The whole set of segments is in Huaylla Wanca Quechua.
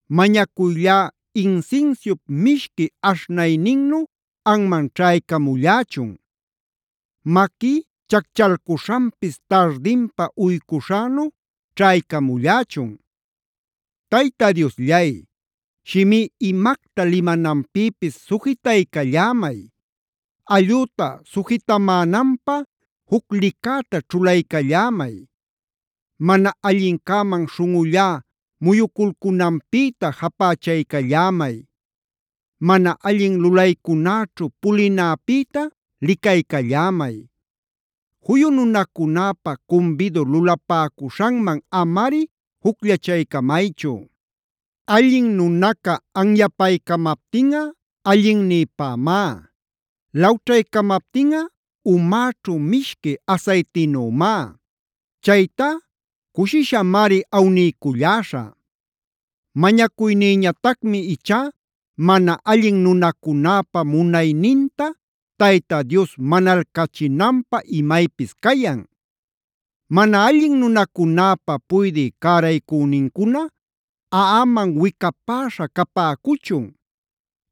Mañacuyllá insinsiup mishqui aśhnayninnu anman ćhaycamullächun.a Maquí chacchalcuśhanpis tardinpa uycuśhänu ćhaycamullächun. Tayta Diosllay, shimí imacta limananpïpis sujitaycallämay. Allüta sujitamänanpä juc licäta ćhulaycallämay. Mana allincäman śhunꞌullá muyuculcunanpïta japächaycallämay. Mana allin lulaycunäćhu pulinäpïta licaycallämay. Juyu nunacunäpä cumbidu lulapäcuśhanman amari jucllachaycamaychu. Allin nunaca anyapaycamaptinꞌa allinnïpämá. Lawćhaycamaptinꞌa umäćhu mishqui asaytinümá. Chaytá cushishamari awniyculläśhä. Mañacuynïñatacmi ichá mana allin nunacunäpa munayninta Tayta Dios manalcachinanpä imaypis cayan. Mana allin nunacunäpa puydï cäraycünincuna aꞌamanb wicapäśha capäcuchun.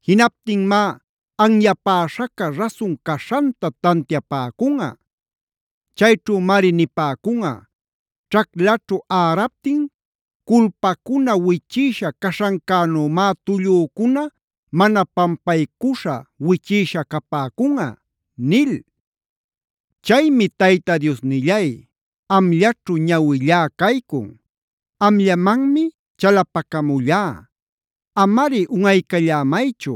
Jinaptinmá anyapaśhäca rasun caśhanta tantiapäcunꞌa. Chayćhümari nipäcunꞌa: “Ćhaclaćhu äraptin culpacuna wichïsha caśhancänümá tullücuna mana pampaycuśha wichïsha capäcunꞌa” nil. Chaymi Tayta Diosnillay, amllaćhu ñawillá caycun. Amllamanmi chalapacamullá; amari unꞌaycallämaychu.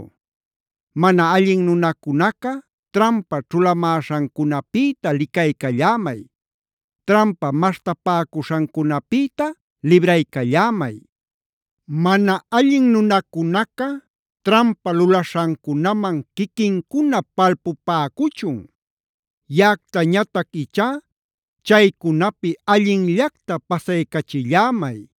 Mana allin nunacunaca trampa ćhulamäśhancunapïta licaycallämay. Trampa maśhtapäcuśhancunapïta libraycallämay. Mana allin nunacunaca trampa lulaśhancunaman quiquincuna palpupäcuchun. Yaꞌactañatac ichá chaycunapi allinllacta pasaycachillämay.